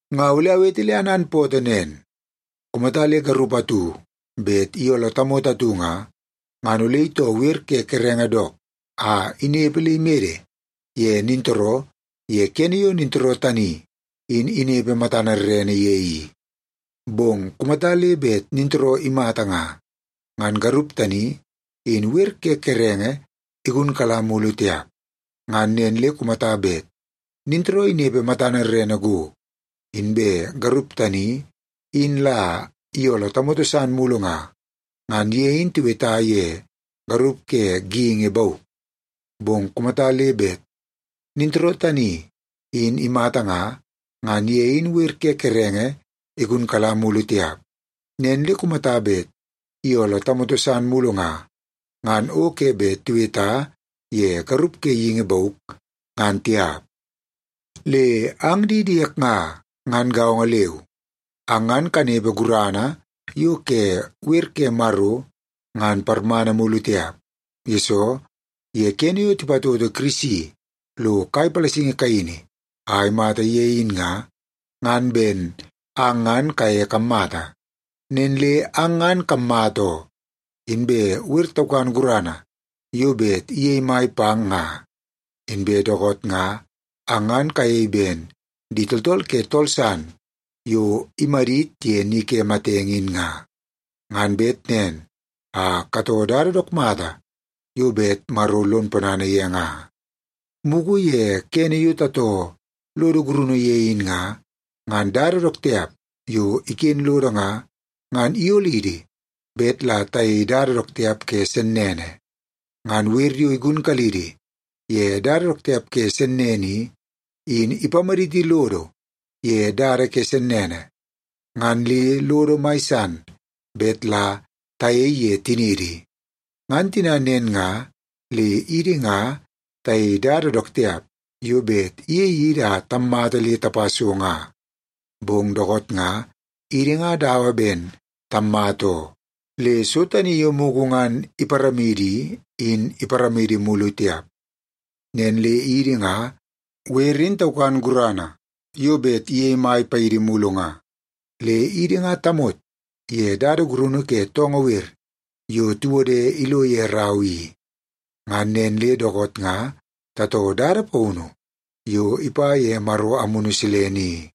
Nga ole awete le ananpootoo nen. Kumata le garup atu bet iyooloo tamoto atu nga, ngan ole itoo wer ke kerenge dook a inepe le imede ye nintooroo ye kene yo nintooroo tani in inepe matana rerene ye i. Bong kumata le bet nintooroo imata nga, ngan garup tani in wer ke kerenge igunkala mulu tiap. Ngan nen le kumata bet nintooroo inepe matana rerene go, inbe garup tani in la iyooloo tamoto san mulu nga, ngan ye in tiweta ye garup ke geingi bauk. Bong kumata le bet nintooroo tani in imata nga, ngan ye in wer ke kerenge igunkala mulu tiap. Nen le kumata bet iyooloo tamoto san mulu nga, ngan o ke bet tiweta ye garup ke geingi bauk, ngan tiap. Le ang di diek nga, ngan gaongo leu, ang ngan kanepe gurana yo ke wer ke Maro ngan parmana mulu tiap, yesoo ye kene yo tipatoto Kirisi lo kai palasingi kaini a imata ye in nga, ngan ben ang ngan kaye kammata. Nen le ang ngan kammata oo, inbe wer taukan gurana yo bet iyei mai pang nga. Inbe dookoot nga, ang ngan kayei ben di tooltool ke tool san yo imadit ye ni ke matenge in nga, ngan bet nen a katoo dada dook mata yo bet Maro lon ponana ye nga. Mugu ye kene yo tatoo lodo gurunu ye in nga, ngan dada dook tiap yo iken lodo nga, ngan iyolidi bet la tayei dada dook tiap ke sennene. Ngan wer yo igunkalidi ye dada dook tiap ke sennene i, in ipamadit lodo ye dada ke sennene, ngan le lodo mai san bet la tayei ye tiniidi. Ngan tina nen nga, le idi nga tayei dada dook tiap yo bet iyei idi a tammata le tapa so nga. Bong dookoot nga, idi nga dawa ben tammata oo, le so tani yo mugu ngan iparamidi i, in iparamidi mulu tiap. Nen le idi nga, wer in taukan gurana yo bet iyei mai paidi mulu nga, le idi nga tamot ye dada gurunu ke toongoo wer yo tiwode ilo ye rau i. Ngan nen le dookoot nga tatoo dada paunu yo ipa ye Maro Amunu Silene i.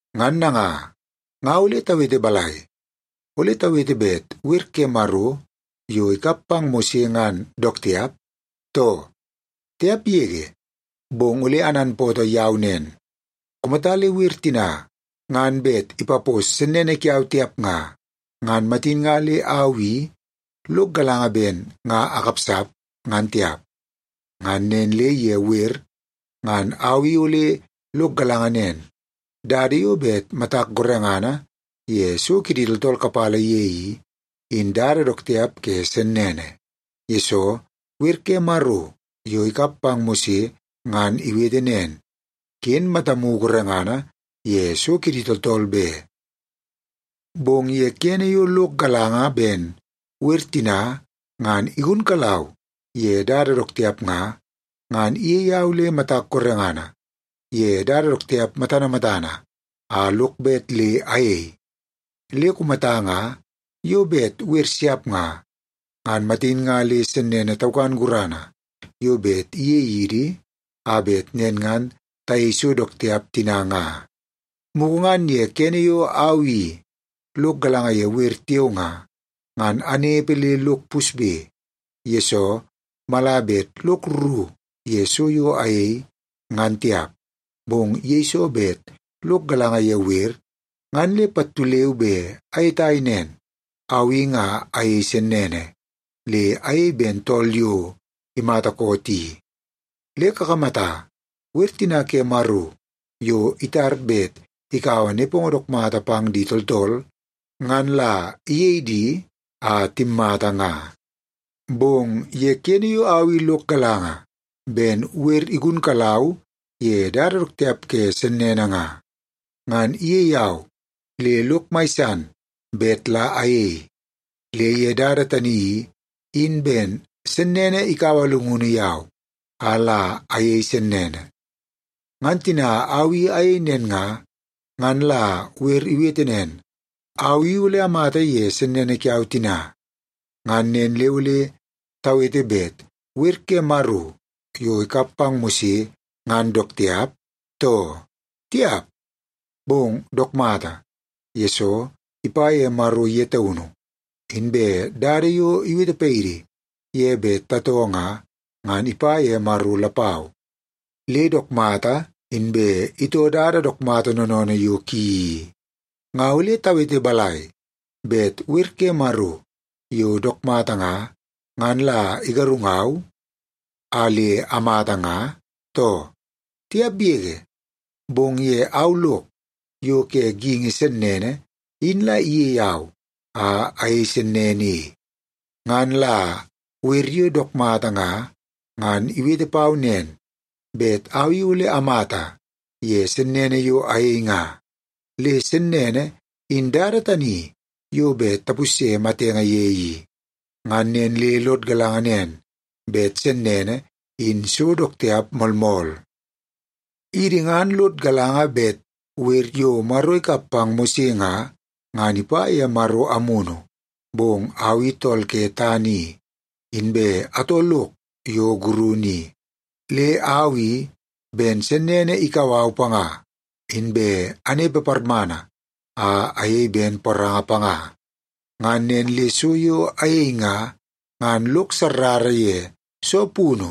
Ngan nanga, nga ole tawete balai? Ole tawete bet wer ke Maro yo ikap pang Mose ngan dook tiap, too? Tiap yege! Bong ole ananpootoo yau nen, kumata le wer tina ngan bet ipapos sennene kiau tiap nga, ngan matin nga le au i lok galanga ben nga akapsap, ngan tiap. Ngan nen le ye wer, ngan au i ole lok galanga nen, dada yo bet matak gorengana ye so kidi tooltool kapala ye i, in dada dook tiap ke sennene, yesoo wer ke Maro yo ikap pang Mose ngan iwete nen, “Ken matamu gorengana ye so kidi tooltool be.” Bong ye kene yo lok galanga ben wer tina ngan igunkalau ye dada dook tiap nga, ngan iyei au le matak gorengana ye dada dook tiap matana matana a lok bet le ayei. Le kumata nga yo bet wer siap nga, ngan matin nga le sennene taukan gurana yo bet iyei idi, a bet nen ngan tayei so dook tiap tina nga. Mugu ngan ye kene yo au i lok galanga ye wer tiao nga, ngan anepe le lok pusbe, yesoo mala bet lok rru ye so yo ayei, ngan tiap. Bong yeiso bet lok galanga ye wer, ngan le pattu leu be ayetai nen, au i nga ayei sennene, le ayei ben tool yo imata koot i. Le kakamata, wer tina ke Maro yo itar bet ikaua nepongo dook mata pang di tooltool, ngan la iyei di a timmata nga. Bong ye kene yo au i lok galanga ben wer igunkalau ye dada dook tiap ke sennene nga, ngan iyei au le lok mai san bet la ayei. Le ye dada tani i, in ben sennene ikaua llungunu yau, a la ayei sennene. Ngan tina au i ayei nen nga, ngan la wer iwete nen, au i ole amata ye sennene kiau tina. Ngan nen le ole tawete bet wer ke Maro yo ikap pang Mose ngan dook tiap, too? Tiap! Bong dook mata, yesoo ipa ye Maro ye taunu. Inbe dada yo iwete paidi ye bet tatoo nga, ngan ipa ye Maro lapau, le dook mata inbe itoo dada dook mata noonoonoo yo ki i. Nga ole tawete balai? Bet wer ke Maro yo dook mata nga, ngan la igarungau a le amata nga, too? Tiap yege! Bong ye au lok yo ke geingi sennene in la iyei au a ayei sennene i. Ngan la wer yo dook mata nga, ngan iwete pau nen, bet au i ole amata ye sennene yo ayei nga. Le sennene in dada tani yo bet tapusye matenge ye i. Ngan nen le lod galanga nen, bet sennene in so dook tiap moolmool. Idi ngan lod galanga bet wer yo Maro ikap pang Mose nga, ngan ipa ye Maro Amunu, bong au i tool ke tana i, inbe atoo lok yo gurunu i. Le au i, ben sennene ikau au panga, inbe anepe parmana a ayei ben poranga panga. Ngan nen le so yo ayei nga, ngan lok sarrara ye soo punu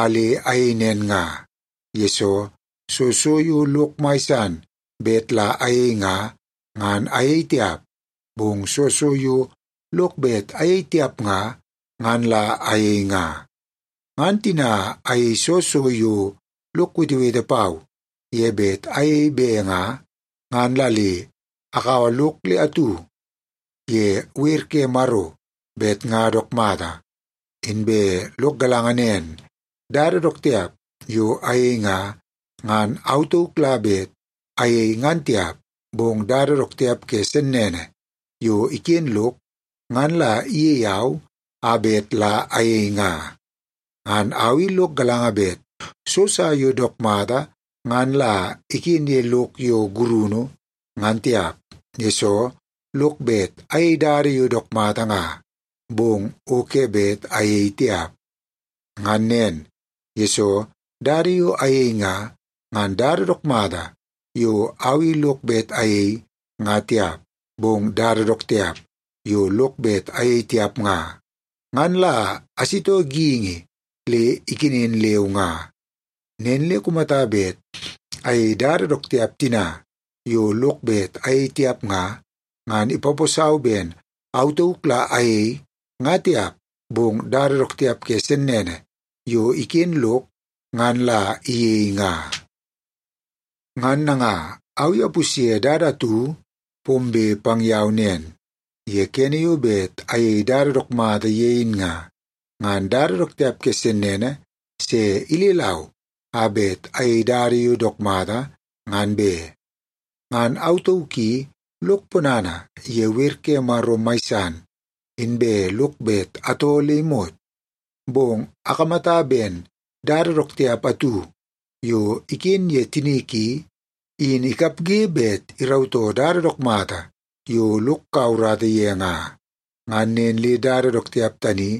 a le ayei nen nga. Yesoo, soo so yo lok mai san bet la ayei nga, ngan ayei tiap, bong soo so yo lok bet ayei tiap nga, ngan la ayei nga. Ngan tina ayei soo so yo lok wetewete pau ye bet ayei be nga, ngan la le agaua lok le atu ye wer ke Maro bet nga dook mata. Inbe lok galanga nen, dada dook tiap yo ayei nga, ngan au tauk la bet ayei ngan tiap, bong dada dook tiap ke sennene yo iken lok ngan la iyei au a bet la ayei nga. Ngan au i lok galanga bet so sa yo dook mata ngan la iken ye lok yo gurunu, ngan tiap, yesoo lok bet ayei dada yo dook mata nga, bong o ke bet ayei tiap. Ngan nen, yesoo dada yo ayei nga, ngan dada dook mata yo au i lok bet ayei, nga tiap. Bong dada dook tiap yo lok bet ayei tiap nga, ngan la asitoo geingi le ikenen leu nga. Nen le kumata bet ayei dada dook tiap tina yo lok bet ayei tiap nga, ngan ipaposau ben au tauk la ayei, nga tiap, bong dada dook tiap ke sennene yo iken lok ngan la iyei nga. Ngan nanga, au i apusye dada atu pombe pang yau nen. Ye kene yo bet ayei dada dook mata ye in nga, ngan dada dook tiap ke sennene se ilelau a bet ayei dada yo dook mata, ngan be. Ngan au tauk i lok ponana ye wer ke Maro mai san, inbe lok bet atoo le imot. Bong akamata ben dada dook tiap atu yo iken ye tinik i, in ikapge bet irautoo dada dook mata yo lok kaua urata ye nga. Ngan nen le dada dook tiap tani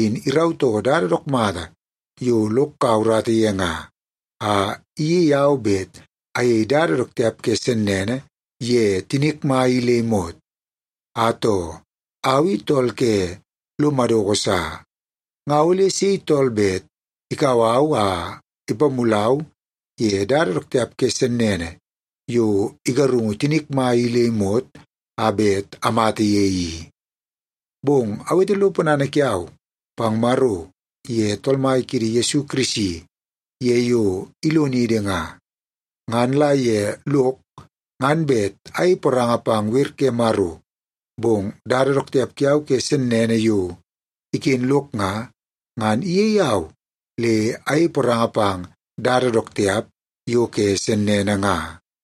in irautoo dada dook mata yo lok kaua urata ye nga, a iyei au bet ayei dada dook tiap ke sennene ye tinik mai i le imot. Atoo, au i tool ke lo madoko sa! Nga ole sei tool bet ikau au a ipamulau ye dada dook tiap ke sennene yo igarungu tinik mai i le imot a bet amata ye i? Bong awete lo ponana kiau pang Maro ye Tool Mai kiidi Yesu Kirisi ye yo ilonidi nga. Ngan la ye lok ngan bet ayei poranga pang wer ke Maro, bong dada dook tiap kiau ke sennene yo iken lok nga, ngan iyei au le ayei poranga pang dada dook tiap yo ke sennene nga.